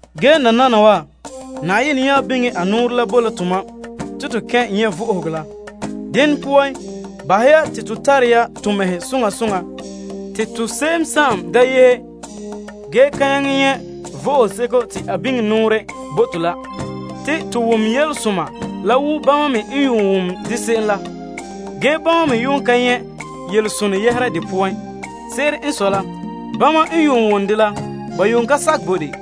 Ge nananawa Na'ayenɛ biŋe a nɔɔrɛ la bo la tomam te to ta'an kɛn' nyɛ' vo'ohogo la. Dene poan, bahɛ ya te to behɛ ha ya to mɛhe soŋa soŋa te to se'em da yehe ge ka nyaŋɛ nyɛ' vo'ohoseko te a biŋe a nɔɔrɛ bo to la. Te to wom yelesoma la wo bama me n yuun wom dɛ se'em la. Ge bama yuun ka nyɛ' yelesonɛ yɛhera de poan. Se'ere n sɔe la bama n yuun wom dela ba yuun ka sakɛ bo de.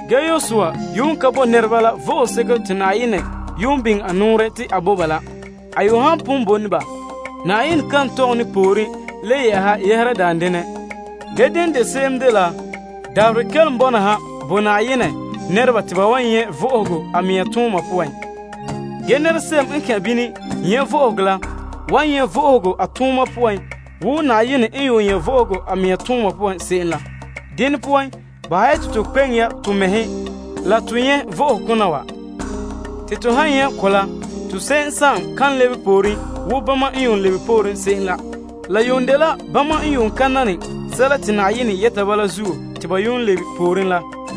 Yosua yuun ka bo nɛreba la vo'ohoseko te Na'ayenɛ yuun biŋe a nɔɔrɛ te a bo ba la. A yuun han pon bo ne ba, Na'ayenɛ kan tɔgɛ ne pooren le yɛ'ɛha yɛhera daan denɛ. Ge dene de se'em la, dabaherɛ kelom bɔna ha bo Na'ayenɛ nɛreba te ba nyɛ' vo'ohogo a mɛŋa tooma poan. Ge se'em n kɛn' bini nyɛ' vo'ohogo la wan nyɛ' vo'ohogo a tooma poan wo Na'ayenɛ n yuun nyɛ' vo'ohogo a mɛŋa tooma poan se'em la. Dene poan, bahɛ ya te to kpeŋe ya to mɛhe la to nyɛ' vo'ohokona wa. Te to han nyɛ' ko bala, to se'em kan lebe pooren wo bama n yuun lebe pooren se'em la. La yuun dela bama n ka nam sɛla te Na'ayenɛ yɛta ba la zuo te ba yuun lebe pooren la.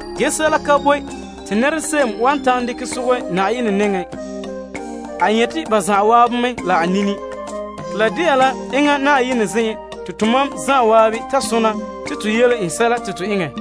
Ge sɛla ka boe wan ta'an sogɛ Na'ayenɛ nɛŋa. A nyɛte ba zan'an mɛ la a nini. Te la de'a la enŋa Na'ayenɛ zen'en te tomam zan'an ta sona te to yele en sɛla te to eŋɛ.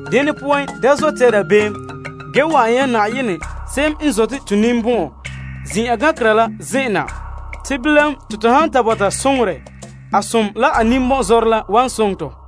Dene poan, da zote ya dabeem ge wa'an ya Na'ayenɛ zo'ohogɔ zen'en la na. Te bilam te to han ta bɔta soŋorɛ, a zo'ohogɔ la a ninbɔn'zɔrɛ la wan soŋɛ tɔ.